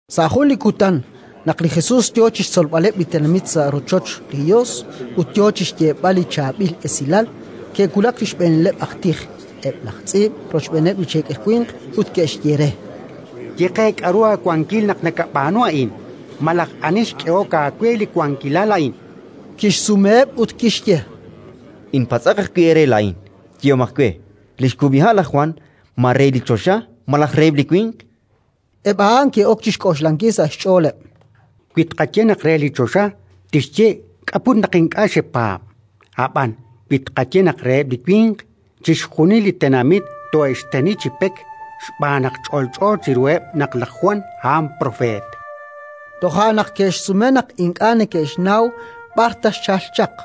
Sa' jun li kutan, naq li Jesus yo chi xtzolb'aleb' li tenamit sa' rochoch li Yos ut yo chi xyeeb'al li Chaab'il Esilal, ke'wulak li xb'eenileb' aj tij, eb' laj tz'iib' rochb'eeneb' li cheekel winq, ut ke'xye re: —Ye qe k'aru aawankil naq nakab'aanu a'in, malaj ani xk'ehok aawe li wankilal a'in? Kixsumeheb' ut kixye: —Inpatz'aq ajwi' eere laa'in. Yehomaq we: li xkub'iha' laj Jwan, ma re li choxa malaj reheb' li winq? Eb' a'an ke'ok chi xk'oxlankil sa' xch'ooleb': “Wi tqaye naq re li choxa, tixye: «K'a' put naq ink'a' xepaab'?». Ab'an wi tqaye naq reheb' li winq, chixjunil li tenamit toohe'xteni chi pek, xb'aan naq ch'olch'o chiruheb' naq laj Jwan a'an propeet”. Jo'kan naq ke'xsume naq ink'a' neke'xnaw b'ar ta xchalk chaq.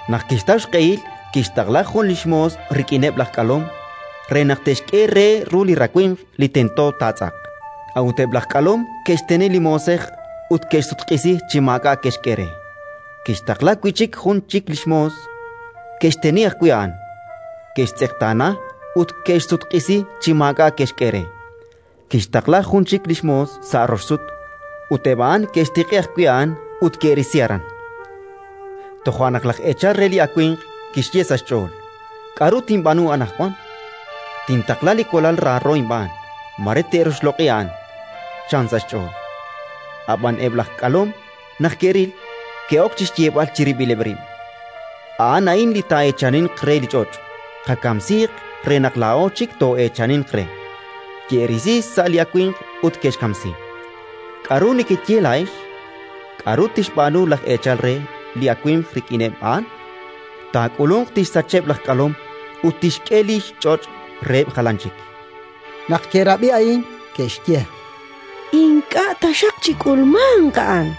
Naq kixtaw xq'ehil, kixtaqla jun li xmoos rik'ineb' laj k'alom, re naq te'xk'e re ru li rawimq li tento taatz'aq. A'ut eb' laj k'alom ke'xteni li moosej ut ke'xsutq'isi chi maak'a' ke'xk'e re. Kixtaqla wi' chik jun li xmoos: ke'xteni ajwi' a'an, ke'xtz'eqtaana ut ke'xsutq'isi chi maak'a' ke'xk'e re. Kixtaqla jun chik li xmoos sa' rox sut; ut eb' a'an ke'xtiq'i ajwi' a'an ut ke'risi aran. “Toja' naq laj eechal re li awimq kixye sa' xch'ool: «K'aru tinb'aanu anaqwan? Tintaqla li walal raaro inb'aan; mare te'roxloq'i a'an», chan sa' xch'ool. Ab'an eb' laj k'alom naq ke'ril, ke'ok chi xyeeb'al chirib'ileb' rib': «A'an a'in li taa'eechaninq re li ch'och'. Qakamsiiq re naq laa'o chik too'eechaninq re». Ke'risi sa' li awimq ut ke'xkamsi. “K'aru nekeye laa'ex? K'aru tixb'aanu laj eechal re li awimq rik'ineb' a'an? Taak'ulunq, tixsacheb' laj k'alom ut tixk'e li xch'och' reheb' jalan chik”. Naq ke'rab'i a'in, ke'xye: —Ink'a' taxaq chik'ulmanq a'an.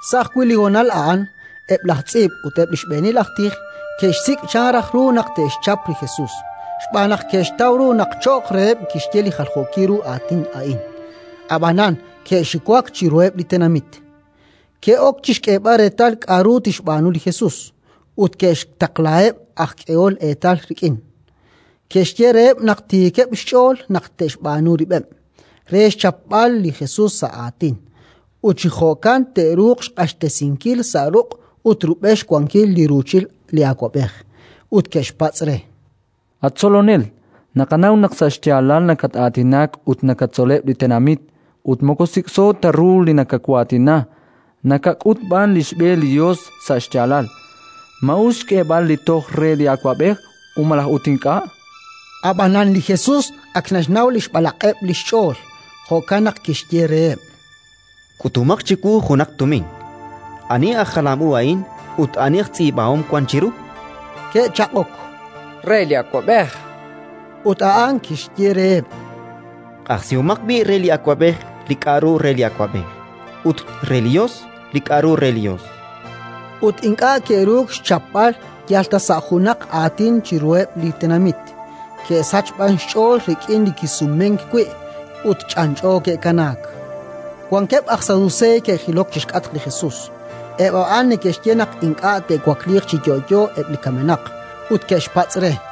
Sa' ajwi' li honal a'an eb' laj tz'iib' ut eb' li xb'eenil aj tij ke'xsik' chan raj ru naq te'xchap li Jesus, xb'aan naq ke'xtaw ru naq cho'q reheb' kixye li jaljookil ru aatin a'in; ab'anan ke'xiwak chiruheb' li tenamit. Ke'ok chi xk'eeb'al reetal k'aru tixb'aanu li Jesus, ut ke'xtaqlaheb' aj k'ehol eetal rik'in. Ke'xye reheb' naq tiikeb' xch'ool naq te'xb'aanu rib'eb' re xchapb'al li Jesus sa' aatin, ut chi jo'kan te'ruuq xq'axtesinkil sa' ruq' ut rub'el xwankil li ruuchil li awab'ej. Ut ke'xpatz' re: —At Tzolonel, naqanaw naq sa' xyaalal nakat-aatinak ut nakatzoleb' li tenamit, ut moko sik'so ta ru li nakawaatina, nakak'ut b'an li xb'e li Yos sa' xyaalal. Ma us xk'eeb'al li toj re li awab'ej, malaj ut ink'a'? Ab'anan li Jesus ak naxnaw li xb'alaq'eb' li xch'ool; jo'kan naq kixye reheb': —K'utomaq chiwu junaq tumin. Ani aj jalam u a'in ut ani aj tz'iib'ahom wank chiru? Ke'chaq'ok: —Re li awab'ej, chankeb'. Ut a'an kixye reheb': —Q'ajsihomaq b'i' re li awab'ej li k'aru re li awab'ej, ut re li Yos li k'aru re li Yos. Ut ink'a' ke'ruuk xchapb'al yal ta sa' junaq aatin chiruheb' li tenamit, ke'sachk b'an xch'ool rik'in li kisumenk wi', ut ch'anch'o ke'kanaak. Wankeb' aj Saduseey ke'jilok chi xk'atq li Jesus (eb' a'an neke'xye naq ink'a' te'wakliiq chi yo'yo eb' li kamenaq), ut ke'xpatz' re: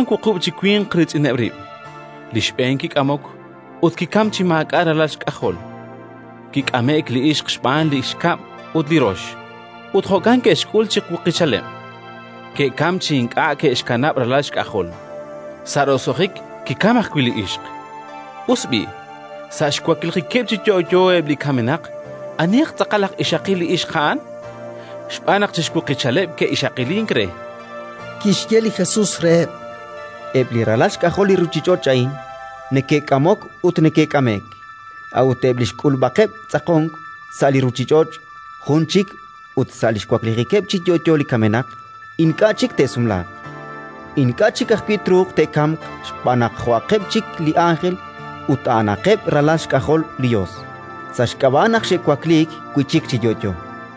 Ke'wank wuqub' chi winq riitz'ineb' rib'. Li xb'een kik'amok ut kikamk chi maak'a' ralal xk'ajol. Kik'ame'k li ixq xb'aan li xkab' ut li rox; ut jo'kan ke'xk'ul chi xwuqichaleb': ke'kamk chi ink'a' ke'xkanab' ralal xk'ajol. Sa' roso'jik kikamk ajwi' li ixq. Us b'i', sa' xwaklijikeb' chi yo'yo eb' li kamenaq, anihaq tz'aqal aj ixaqil li ixq a'an? Xb'aan naq chi xwuqichaleb' ke'ixaqilink re. Kixye li Jesus reheb': —Eb' li ralal xk'ajol li ruuchich'och' a'in neke'k'amok ut neke'k'ame'k. A'ut eb' li xk'ulub'aqeb' tz'aqonk sa' li ruuchich'och' jun chik ut sa' li xwaklijikeb' chi yo'yo li kamenaq ink'a' chik te'sumlaaq. Ink'a' chik ajwi' truuq te'kamq xb'aan naq jo'aqeb' chik li ánjel ut a'anaqeb' ralal xk'ajol li Yos, sa' xk'ab'a' naq xe'wakliik wi' chik chi yo'yo.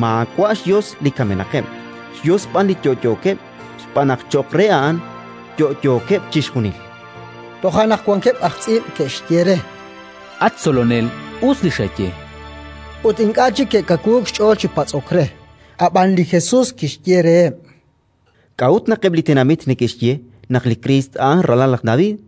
Maawa' xYos li kamenaqeb', xYos b'an li yo'yookeb', xb'aan naq cho'q re a'an yo'yookeb' chixjunil! Toja' naq wankeb' aj tz'iib' ke'xye re: —At Tzolonel, us li xaye. Ut ink'a' chik ke'kawuuk xch'ool chi patz'ok re. Ab'an li Jesus kixye reheb': —K'a'ut naq eb' li tenamit neke'xye naq li Kriist a'an ralal laj David?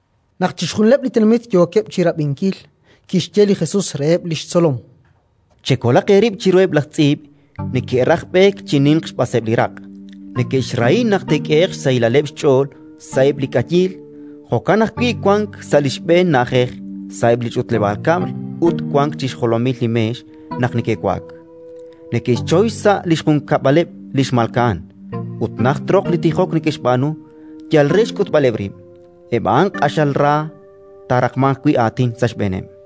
Naq chixjunileb' li tenamit yookeb' chi rab'inkil, kixye li Jesus reheb' li xtzolom: —Chekolaq eerib' chiruheb' laj tz'iib': neke'raj b'eek chi ninq xb'aseb' li raq', neke'xrahi naq te'k'ehe'q xsahilaleb' xch'ool sa'eb' li k'ayiil, jo'kan ajwi' wank sa' li xb'een na'ajej sa'eb' li ch'utleb'aal kab'l ut wank chi xjolomil li meex naq neke'wa'ak; neke'xchoy xsa' li xjunkab'aleb' li xmalka'an, ut najt roq li tijok neke'xb'aanu yal re xk'utb'aleb' rib'. Eb' a'an q'axal ra taaraqmanq wi' aatin sa' xb'eeneb'.